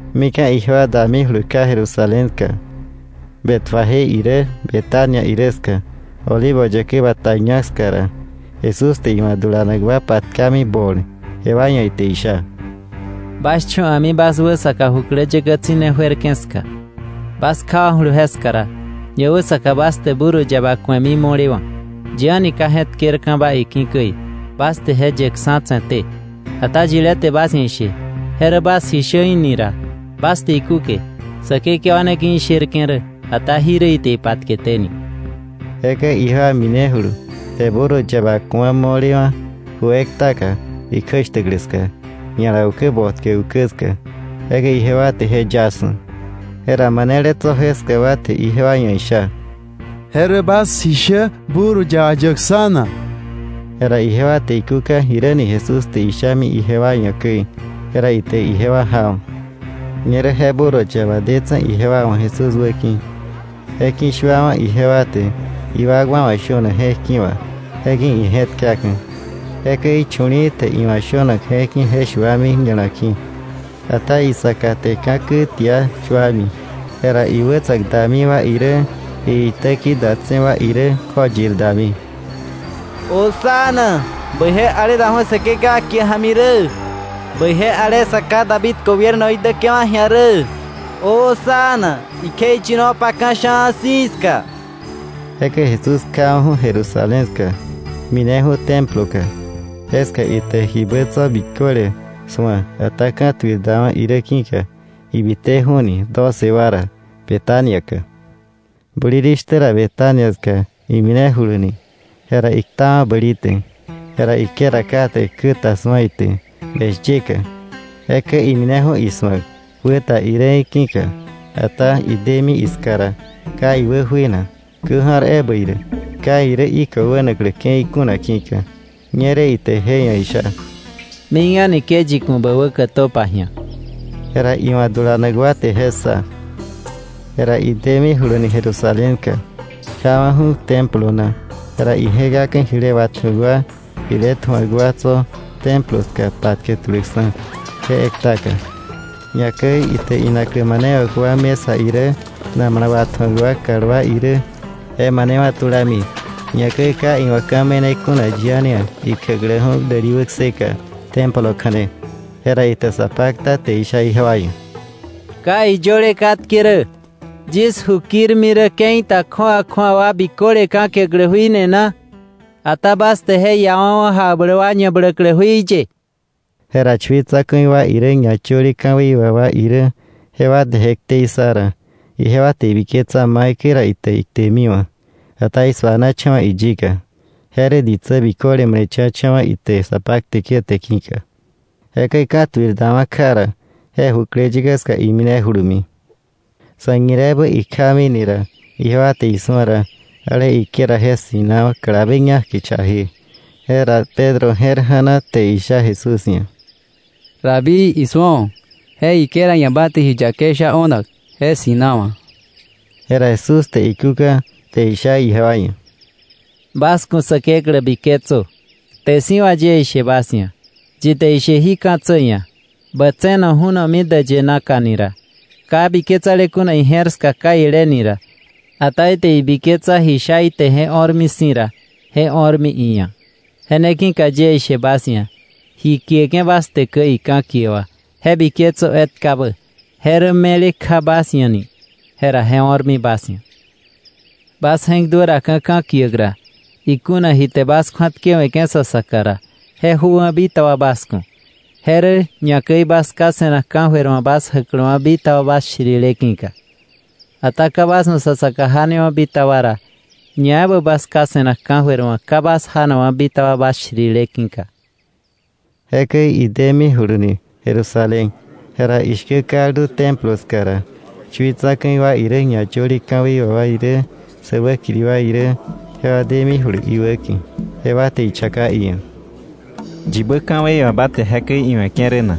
Mika̱ ijewa damijulu kja Jerusalén ska, Betfagé irä Betania irä ska, Olivo Yäkä Bata ñak ska ra, Jesús te iwa̱ dulanak wa patkami bol. Jewa ia̱ ite isha: —Bas cho̱ a̱mi bas wäsaka jukläyäkä tsi̱ne juerke̱ ska. Bas kjawa̱julu jeska ra, ñawäsaka bas te burro yaba ku̱emi mo̱lewa̱, yi a̱ni ka je̱tkerba iki̱ käi; bas te je yeksa̱ tse̱té. Ata yilé te bas ia̱ ishe: ‘Je rä bas ji shä’ í̱ ni ra, bas te ikúke: ‘Säkekewa ne ki̱ isherke̱ rä, ata jirä ite ipatketéni.’ Jekäi ijewa minejulu, te burro yaba ku̱a mo̱lewa̱ ju ektaka ikjäshtäklä ska, ña̱la ukä botkä ukä ska, jekäi ijewa te je yaksa̱. Jera manele tso̱ jeska wa te ijewa iia̱ isha: —¿Je rä bas ji shä burro yaba yäkksa̱ na? Jera ijewa te ikúka jiräni Jesús te ishami ijewa ia̱ käi, jera ite ijewa jawa̱. Ñerä je burro yaba detse̱ ijewa wa̱ Jesús wäki̱, je ki̱shuawa̱ ijewa te iwakwa wa̱ shönak je̱k ki̱ wà, je ki̱ ije̱tkaka̱. Jekäi chu̱li̱i̱ te iwa̱ shönak je̱k ki̱ je shuami ña̱la ki̱, ata isaka te ka̱kä tia shuami. Jera iwätsa̱k dami wa irä iitäki̱ datse̱ wa irä kjoyir dami: “¡Hosana! ¡Bäije ale daju̱ Säkekewa kie ja̱mi rä! Bäije ale sa ká David gobiernoí däke̱wa̱ ji̱a rä. ¡Hosana ikjeiyinopa ka̱sha̱a̱ si̱ ska! Jekäi Jesús kjawa̱ju̱ Jerusalén ska, mineju̱ Temploka. Jeska ite jibä tso̱ biköle su̱a. Ata ka̱tuir dawa̱ irä ki̱ka ibiteju̱ni doce wa ra Betania ka. Bulirishtä ra Betania ska iminejuluni, jera iktawa̱ bäli te. Jera higuera kate kä ta su̱a ite beshyeka, jekäi imineju̱ isu̱ak wä ta irä í̱ ki̱ka; ata idemi iska ra, ka iwä juena, kä ja̱r ebä irä, ka irä higo wänaklä ke̱i kuna ki̱ka. Ñerä ite je ia̱ isha: —Mik a̱ni ke yi ku̱ bä wä kätöpa ji̱a. Jera iwa̱ dulanak wa te je ssa. Jera idemijuluni Jerusalén ka, kjawa̱ju̱ Templo na. Jera ije̱kaka̱ jile watju̱ak wa, jile tju̱ak wa tso̱ Templo ska patkä tuläkksa̱ je ektaka, ñakäi ite inaklä manewa̱k wa mesa irä, namala watju̱ak wa kalwá irä, je manewa̱ tulami. Ñakäi ka iwa̱ ka̱ me̱ne kuna yi a̱ni ia̱ ikjäkläju̱ däli wäkseka Templo kja̱ne. Jera ite sa pakta te isha ijewa ia̱: —¿Ka iyöle katke rä: “Yis ju kirmi rä ke̱i ta kju̱awa kju̱awa wa biköle ka̱kiäklä jui ni na?” Ata bas te je iawa̱wa̱ jakbläk wa ñabläklä jui ye. Jera chui tsa̱ku̱i wa irä ñayöle ka̱wei wà wa irä jewa te je ktei ssa ra, ijewa te ibiketsa maikäi ra ite iktemiwa̱. Ata isuanacha̱wa̱ iyika, je rä ditsä biköle male̱cha̱cha̱wa̱ ite sa pakteke̱ te ki̱ka. Jekäi ka̱tuir dawa̱ kja ra, je jukläyäkä ska iminejulumi. Sa̱ñireebä ikjamini ra, ijewa te isu̱a ra, ale higuera je ssi̱nawa̱ kalabe ñak kichaje. Jera Pedro je̱r ja̱na te isha Jesús ia̱: —Rabí, isu̱o. Je higuera ia̱ ba te ji yakei sha o̱nak, je ssi̱nawa̱. Jera Jesús te ikúka te isha ijewa ia̱: —Bas ku̱ Säkeklä biketsö. Kte si̱ wà yie ishe bas ia̱, yi te ishe jí ka̱tsä ia̱: “Bä tse̱no ju̱nomi däyë naka” ni ra, ka biketsale kuna ije̱r ska kaile ni ra, ata ite ibiketsa ji sha ite je o̱rmi si̱ ra, jera je o̱rmi iia̱. Je ne ki̱ka yie ishe bas ia̱, ji kieke̱ bas te käi ka̱kie wà, je biketsö etkabä, je rä me̱le kja bas ia̱ ni, jera je o̱rmi bas ia̱. Bas je̱k duäraka̱ ka̱kiäk ra, ikuna ji te bas kju̱atkewe̱ke̱ sa saka ra, je jöwa̱ bitaba bas ku̱, je rä ñakäi bas Ká se̱nak ka̱jöir wa̱ bas jäkläwa̱ bitaba bas shirile ki̱ka. Ata ka bas wa̱ sa saka janewa̱ bitaba ra, ñaebä bas Ká se̱nak ka̱jöir wa̱ ka bas janakwa̱ bitaba bas shirile ki̱ka. Jekäi idemijuluni Jerusalén. Jera ishkä kaldu Templo ska ra, chui tsa̱ku̱i wa irä, ñayöle ka̱wei wà wa irä, sä wäkiri wa irä, jewa demijulu iwäki̱. Jewa te ichaka iia̱: —¿Yibä ka̱wei wà ba te jekäi iwe̱ke̱ rä na?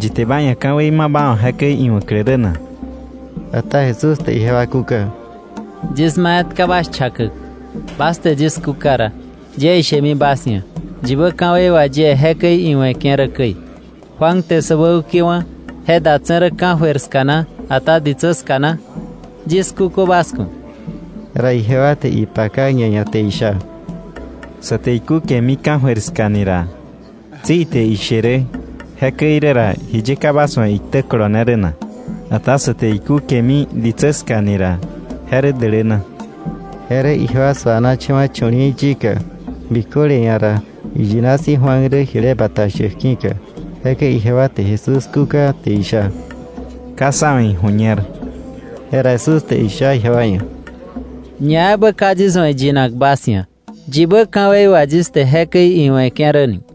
¿Yi te ba ia̱ ka̱wei ma ba wa̱ jekäi iwa̱klä rä na? Ata Jesús te ijewa kúka: —Yis ma etka bas chakäk, bas te yis kúka ra, yie ishemi bas ia̱ yibä ka̱wei wà yie jekäi iwe̱ke̱ rä käi. Juan te sä wäukewa̱, ¿je datse̱ rä ka̱jöir ska na, ata ditsä ska na? Yis kúkö bas ku̱. Jera ijewa te ipaka ñaia̱ te isha: “Sa te ikúkemi ka̱jöir ska ni ra, tsi ite ishe rä: ‘Jekäi irä ra, ¿jiye ka bas wa̱ iktä kolone rä na?’ Ata sä te ikúkemi ditsä ska ni ra, je rä däläna.” Je rä ijewa suanacha̱wa̱ chu̱li̱i̱ yika, biköle ia̱ ra iyina si̱ Juan rä jile bata shäk ki̱ka. Jekäi ijewa te Jesús kúka te isha: —Ka sá wa̱ iju̱ñer. Jera Jesús te isha ijewa ia̱: —Ñaebä ka yis wa̱ iyinak bas ia̱, yibä ka̱wei wà yis te jekäi iwe̱ke̱ rä ni.